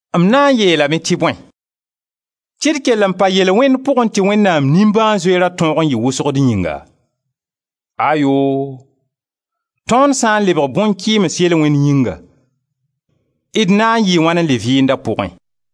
M na n yeelame tɩ bõe? Tɩ d kell n pa yel-wẽnd pʋgẽ tɩ Wẽnnaam nimbãan-zoeerã tõog n yɩ wʋsgo d yĩnga? Ayoo! Tõnd sã n lebg bõn-kɩɩms yel-wẽnd yĩnga, d na n yɩɩ wãn n le vɩɩnd a pʋgẽ?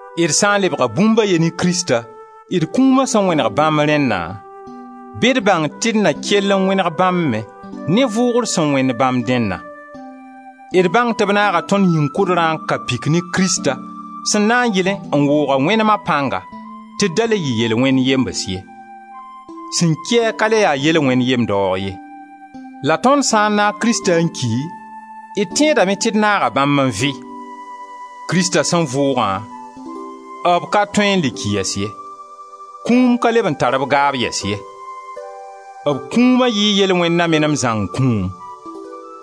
D sã n lebga bũmb a ye ne Krista, d kũuma sẽn wẽneg bãmb rẽnna, bɩ d bãng tɩ d na kell n wẽneg bãmba me ne vʋʋgr sẽn wẽnd bãmb dẽnna. D bãng tɩ b naaga tõnd yĩn-kʋdrã n ka pik ne Krista, sẽn na n yɩlẽ n woog a wẽnema pãnga tɩ d da le yɩ yel-wẽnd yems ye. Sẽn ki-a ka le ya yel-wẽnd yem-daoog ye. La tõnd sã n naag Krista n ki, d tẽedame tɩ d naaga bãmb n vɩ. Krista sẽn vʋʋgã, b ka tõe n le ki yɛs ye, kũum ka leb n tar b gaab yɛs ye. B kũuma yɩɩ yel-wẽnd na menem zãng kũum;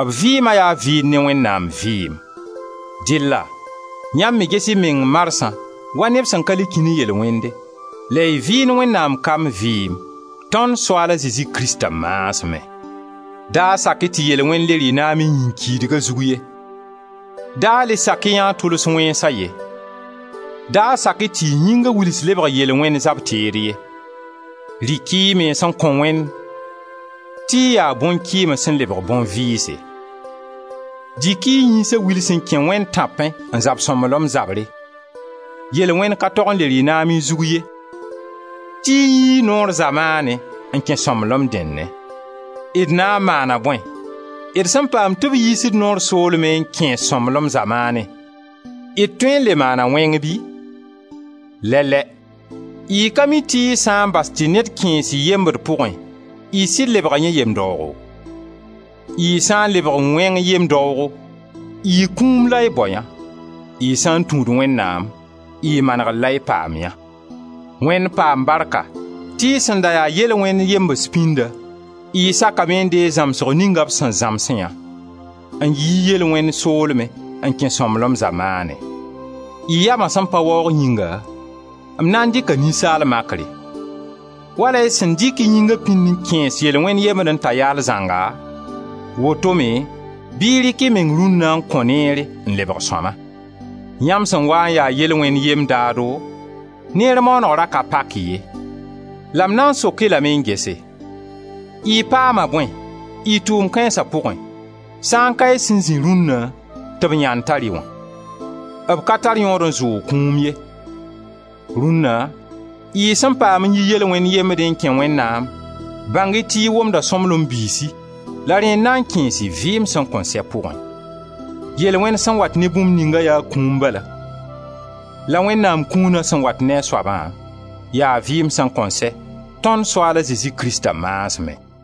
b vɩɩma yaa vɩɩnd ne Wẽnnaam vɩɩm. Dɩlla yãmb me ges y meng marsã wa neb sẽn ka le kĩ ne yel-wẽnde, la y vɩɩnd Wẽnnaam kamb vɩɩm tõnd Soaala Zezi Krista maasmẽ. Da sak-y tɩ yel-wẽnd le rɩ naam y yĩn-kiidga zug ye; da le sak yã a tʋls wẽnsa ye. Da sak-y tɩ y yĩnga wils lebg yel-wẽnd zab-teed ye. Dɩk-y y mens n kõ Wẽnd tɩ y yaa bõn-kɩɩms sẽn lebg nin-vɩɩse. Dɩk-y y yĩnga wils n kẽ Wẽnd tãpẽ n zab sõmblem zabre. Yel-wẽnd ka tog n le rɩ naam y zug ye tɩ y yii Noor zamaanẽ n kẽ sõmblem dẽnnẽ. D na n maana bõe d sẽn paam tɩ b yiis-d Noor soolmẽ n kẽes-d sõmblem zamaanẽ, d tõe n le maana wẽng bɩ? Lɛ-lɛ! Y ka mi tɩ y sã n bas tɩ ned kẽes y yembd pʋgẽ, y sɩd lebga yẽ yem-daoogo? Y sã n lebg wẽng yem-daado, y kũum la y bao yã, y sã n tũud Wẽnnaam, y manegr la y paam yã. Wẽnd paam barka tɩ y sẽn da ya yel-wẽnd yembs pĩnda, y sakame n deeg zãmsg ninga b sẽn zãms yã, n yi yel-wẽnd soolmẽ n kẽ sõmblem zamaanẽ. Y yama sẽn pa waoog yĩnga m na n dɩka ninsaal makre. Wala y sẽn dɩk y yĩnga pĩnd n kẽes yel-wẽnd yembdẽ t'a yaal zãnga, woto-me bɩ y rɩk y meng rũnna n kõ neere n lebg sõma. Yãmb sẽn waa n ya yel-wẽnd yem-daado, neer maaneg ra ka pak-y ye. La m na n sok-y lame n gese, y paama bõe y tʋʋm kãensa pʋgẽ sã n ka y sẽn zĩ rũnna tɩ b yãnd tar-y wã? B ka tar yõod n zʋʋg kũum ye. Rũnna y sẽn paam n yi yel-wẽnd yembdẽ n kẽ Wẽnnaam, bãng-y tɩ y womda sõmblem biisi la rẽ n na n kẽes-y vɩɩm sẽn kõn sɛ pʋgẽ. Yel-wẽnd sẽn wat ne bũmb ninga yaa kũum bala; la Wẽnnaam kũuna sẽn wat ne a soaba, yaa vɩɩm sẽn kõn sɛ, tõnd Soaala Zezi Krista maasmẽ.